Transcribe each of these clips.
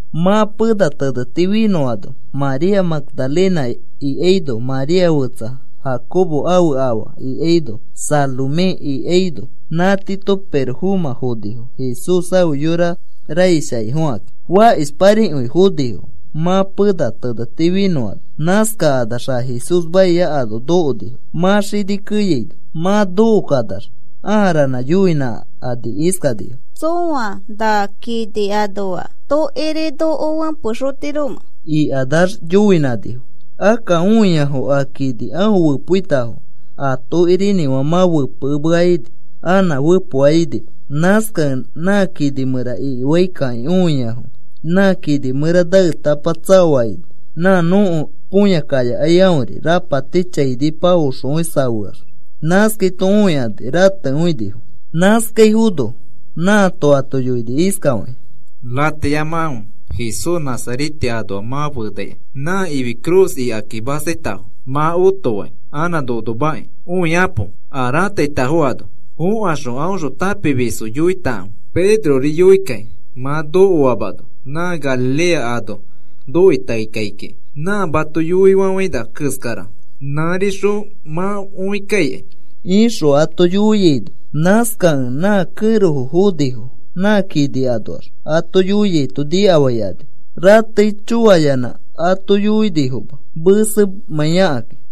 Mã pena teneti finõano María Magdalena ikaino, María fetsa Jacobo ãfe afa ikaino, Salomé ikaino, nã tiito pirofomã fonifo, Jesús ãfe yora raish akĩ foxikaki. Fakishparikõi fonifo mã pena teneti finõano nãskanax a Jesús maia ano nokonifo, mã xini keyaino. Mã nokokanax ãa ranã yoinãkani iskanifo: “¿Tsõa na kini anoa tokiri noko fẽpexotiromẽ?” ikanax yoinãnifo. Akka õiafo a kini aõ fepoitafo a tokirinĩfã, mã fepekemea ini, anã fepoa inima. Nãskakẽ nã kini mẽra ikifaikakĩ õiafo. Nã kini mẽra naetapa tsaoa ini, nã nõko põya kayakai aõri. Rapati chainipa oxokõi safeax, nãskaito õikani ratekõinifo. Nãskaifono nãato ato yoini iskafakĩ: “Rateyamakãfe, Jesús Nazarete anoa mã fenaikai nã ifi cruz ikaki mastaitafo mã otoaki anã nonomaki. Õikapo a rãtaitafo ano. Fokaxõ aõxõ tãpimisfo yoitakãfe, Pedrori yoikakĩ mã nokoamano nã Galilea ano nokoi taei kai kiki. Nã mato yoifafaina keskara nãrixõ mã õikaikai,” ixõ ato yoiaino, nãskakẽ nã kẽrofo fonifo nã kini anoax ato yoiaito nikafaikani. Ratei choayanã ato yoinifoma, mesemãiakaki.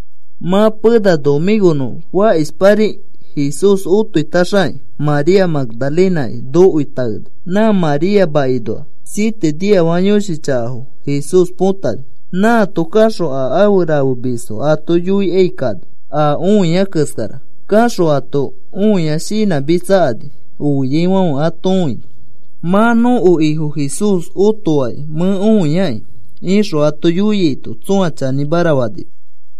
Mã pena nomĩkonõ fakishpari Jesús otoitaxaki, María Magdalenaki nokoi taeni, nã María makinoa siete niafaka yõshi chakafo Jesús põtani. Nãato kaxõ a afe rafemisfo ato yoikai kani a õia keskara. Kaxõ ato õia shinãmitsakani oiaifãfe ato õini. “Mã nõko Ifo Jesús otoakĩ mẽ õiaki,” ixõ ato yoiaito, tsõa chanĩmara fanima.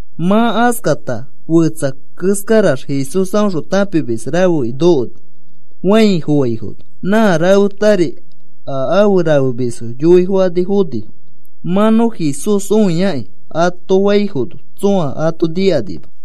Mã askata fetsa keskarax Jesús aõxõ tãpimis rafeki nokoni fãi foaifono. Nã rafetari a afe rafemisfo yoifokani fonifo. “Mã nõ Jesús õiaki,” ato faifono, tsõa ato nikanima.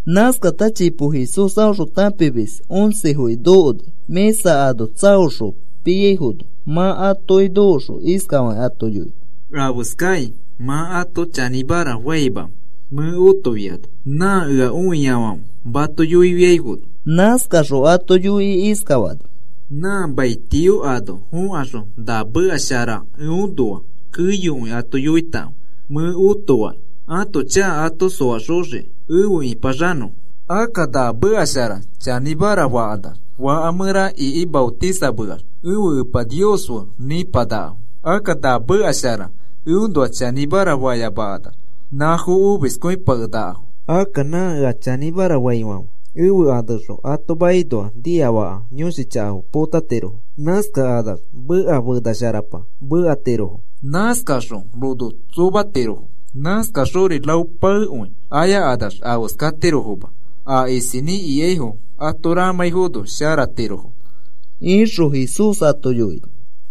Nãskata chipo Jesús aõxõ tãpimis oncefoki nokoni, mĩsa ano tsaoxõ piaifono. Mã atoki nokoxõ iskafakĩ ato yoini: “¿Afeskakĩ mã ato chanĩmara famamẽ mẽ otofiano nã ea õiafãfe mato yoiaifono?” Nãskaxõ ato yoikĩ iskafani: “Nã mai tio ano fokaxõ na meka shara eõnoa keyokõi ato yoitakãfe mẽ otoakĩ ãto chaka ato soaxoxiki efe ĩpaxanõfo. Akka na meka shara chanĩmara fakanax, faka mẽra iki maotisameax ẽfe Epa Nios fe nĩpanakafo. Akka na meka shara eõnoa chanĩmara fayamakanax, nãfo omiskõipakenakafo. Akka nã ea chanĩmara faifãfe, ẽfe aneõxõ ato makinoa niafaka yõshi chakafo potatirofo. Nãskakanax meka fena sharapa mekatirofo. Nãskakaxõ rono tsomatirofo nãskakaxori rao paekõi ayakanax afeskatirofoma. A isinĩ ikaifori ato ramãifono sharatirofo,” ixõ Jesús ato yoini.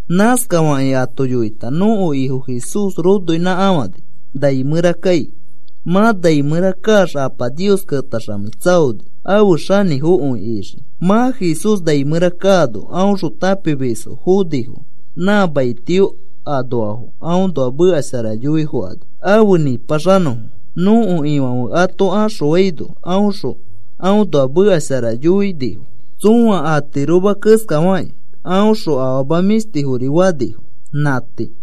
Nãskafakĩ ato yoita, nõko Ifo Jesús ronoinãkafãni nai mẽra kai. Mã nai mẽra kaax Apa Nios ketaxamei tsaoni afe xanĩfokõi ixiki. Mã Jesús nai mẽra kaano aõxõ tãpimisfo fonifo. Nã mai tio anoafo aõnoa meka shara yoifokani afe nĩpaxanõfo. Nõko Ifãfe ato axõfaino aõxõ aõnoa meka shara yoikõinifo, tsõa atiroma keskafakĩ aõxõ afama mĩshtifori fanifo. Nã tii.